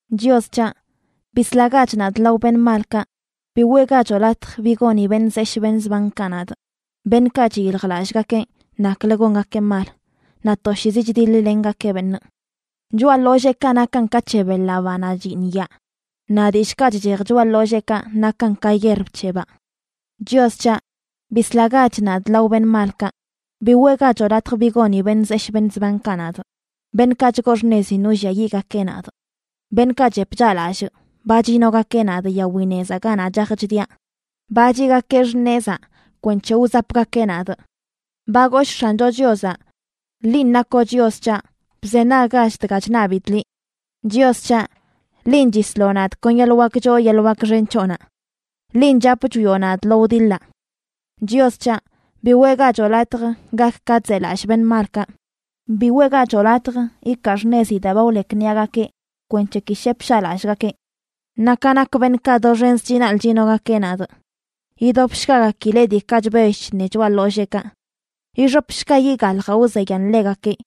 Chios c̱haꞌ, bislagach nadꞌ lao beṉꞌ malkaꞌ; bi weꞌgachoꞌ latj bi goni beṉꞌ zeshꞌ beṉꞌ zbankaꞌ nadꞌ, beṉꞌkaꞌ chiyiljlallꞌgakeꞌ naklə gongakeꞌ mal, naꞌ toshiizi chdiḻ-lengakeꞌ beṉꞌ. Choꞌa ḻolleekaꞌ nakan ka c̱he beḻaꞌ, banaꞌ chyiṉyaa; naꞌ dillꞌkaꞌ chchej choꞌa ḻolleekaꞌ nakan ka yierb c̱hebaꞌ. Chios c̱haꞌ, bislagach nadꞌ lao beṉꞌ malkaꞌ; bi weꞌgachoꞌ latj bi goni beṉꞌ zeshꞌ beṉꞌ zbankaꞌ nadꞌ, beṉꞌkaꞌ chgoo xṉezin wlliayiꞌgakeꞌ nadꞌ. Beṉꞌkaꞌ chep chaꞌlallꞌ ba chiꞌnogakeꞌ nadꞌ yawi nezaꞌ ganaꞌ chaj chdiaꞌ. Ba chiꞌgakeꞌ xṉezaꞌ kwenc̱he wzapgakeꞌ nadꞌ. Ba goshꞌ X̱ancho Chiozaꞌ: “Linꞌ nakoꞌ Chios c̱haꞌ, bzenaggach dga chṉabidꞌ liꞌ. Chios c̱haꞌ, linꞌ chisloꞌ nadꞌ kon yeḻꞌ wak choo yeḻꞌ wak xen c̱hoꞌnaꞌ. Linꞌ chap chwioꞌ nadꞌ lo wdiḻaꞌ.” Chios c̱haꞌ, bi weꞌgachoꞌ latj gak ka chzelallꞌ beṉꞌ malkaꞌ; bi weꞌgachoꞌ latj ikaa xṉezi daa ba wlekniꞌagakeꞌ, kwenc̱he ki shep shaꞌlallꞌgakeꞌ. Naꞌ ka nak beṉꞌkaꞌ doxenz chinaḻꞌ chinogakeꞌ nadꞌ, yidobshgagakileꞌ diikaꞌ chbell chṉe choꞌa ḻolleekaꞌ. Ixopshga yiꞌ galjaꞌ wzeyan ḻegakeꞌ.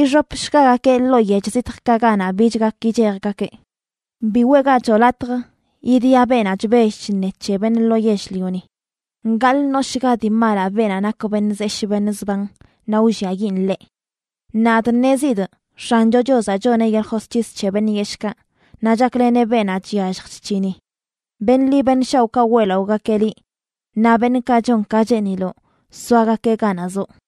Ixopshgagakeꞌ ḻoo yech zitjkaꞌ ganaꞌ bich gak yichejgakeꞌ. Bi weꞌgachoꞌ latj idia beenaꞌ chbell chṉe c̱he beṉꞌ lo yell-lioni; gaḻꞌ ṉoshga dii malaꞌ beenaꞌ nak beṉꞌ zeshꞌ beṉꞌ zban naꞌ wlliayiꞌn ḻeꞌ. Nadꞌ ṉezidꞌ X̱ancho Chiozaꞌ choneꞌ yeḻꞌ josc̱his c̱he beṉꞌ yeshꞌkaꞌ, naꞌ chakleneꞌ beenaꞌ chyallj chc̱hini. Beṉꞌ ḻi beṉꞌ shaoꞌkaꞌ weꞌlaꞌogakeꞌ liꞌ; naꞌ beṉꞌkaꞌ chon ka cheeniloꞌ soagakeꞌ ganaꞌ zoꞌ.